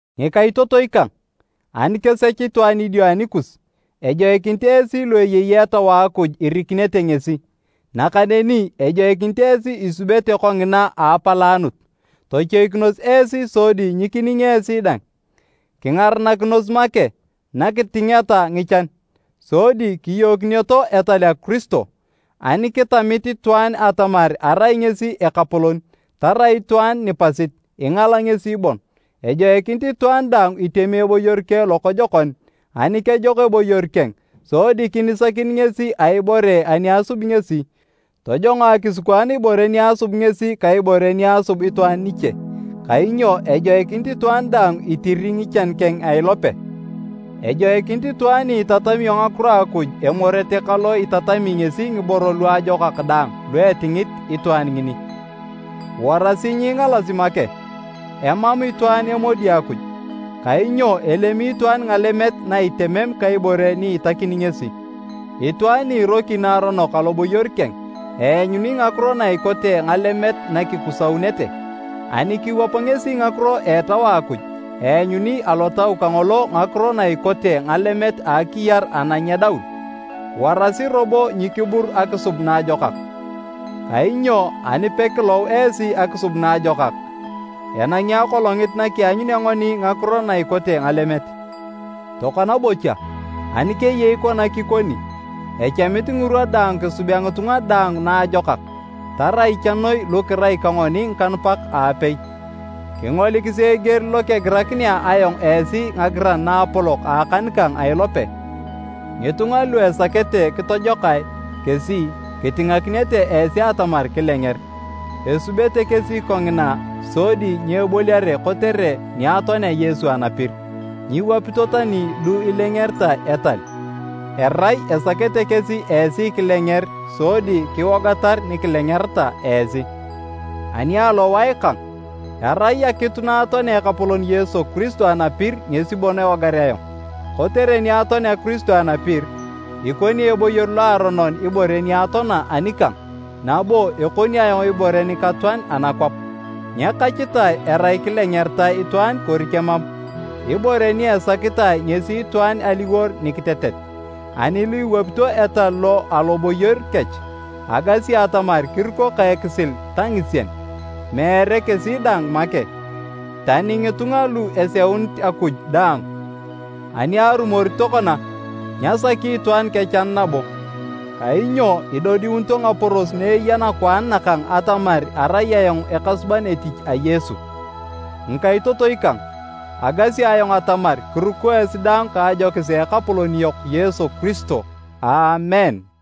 Ngikaitotoi kang, ani kesech itwaan idio anikus, ejoikinit esi lu eyei Etau a Akuj irikinete ngesi. Nakaneni ejoikinit esi isubete kongina a apalaanut. Tochoikinos esi sodi nyikining esi dang. Kingaranakinos make nakitingeta ngichan, sodi kiyookineto etal a Kiristo. Ani kitamit itwaan atamar arai ngesi ekapolon, tarai itwaan nipasit, ingala ngesi bon. Ejoikinit itwaan daang itemi eboyor keng lokojokon. Ani kejok eboyor keng, sodi kinisakin ngesi a ibore ani asub ngesi, tojongo akisikwaan ibore ni asub ngesi ka ibore ni asub itwaan niche. Kainyo ejoikinit itwaan daang itiri ngichan keng a ilope. Ejoikinit itwaan ni itatamio ngakiro a Akuj emorete ka lo itatami ngesi ngiboro luajokak daang lu etingit itwaan ngini. Warasi nyiingalasi make, emam itwaan emodi Akuj. Kainyo elemi itwaan ngalemet na itemem ka ibore ni itakini ngesi. Itwaan ni iroki naaronok aloboyor keng, eanyuni ngakiro na ikote ngalemet nakikusaunete. Ani kiwap ngesi ngakiro a Etau Akuj, eanyuni alotau kangolo ngakiro na ikote ngalemet a akiyar ana nyedaun. Warasi robo nyikibur akisub naajokak, kainyo ani pekilou esi akisub naajokak, enangi akolongit nakianyunea ngoni ngakiro na ikote ngalemet. Tokona bocha, ani keyei kona kikoni, echamit ngirwa daang kisubea ngitunga daang naajokak, tarai cha noi lu kirai ka ngoni ngikanupak aapei. Kingolikisi eger lokegirakinea ayong esi ngagiran naapolok a akan kang a ilope! Ngitunga lu esakete kitojokae kesi kitinganakinete esi atamar kilenger. Esubete kesi kongina sodi nyeboliare kotere ni atoanea Yesu anapir. Nyiwapito tani lu ilengeritae etal, erai esakete kesi esi kilenger sodi kiwogatar ni kilengereta esi. Ani alowae kang, erai akitu naatoanea Ekapolon Yesu Kiristo anapir ngesi bon ewogar ayong. Kotere ni atoanea Kiristo anapir, ikoni eboyor loaronon ibore ni atoana anikang nabo ekoni ayong ibore nikatoan anakwap. Nyekachitae erai kilengeritae itwaan kori kemam, ibore ni esakitae ngesi itwaan aliwor nikitetet. Ani lu iwapito etal lo aloboyor kech, agasi atamar kiruko ka ekisil ta ngisien, meere kesi dang make, tani ngitunga lu eseunit Akuj daang! Ani arumori tokona, nyasaki itwaan kechan nabo, kainyo idodiunito ngaporos na eya nakwaan nakang atamar arai ayong ekasuban etich a Yesu. Ngikaitotoi kang, agasi ayong atamar kiruko esi daang ka ajokis a Ekapolon yok Yesu Kiristo. Aamen.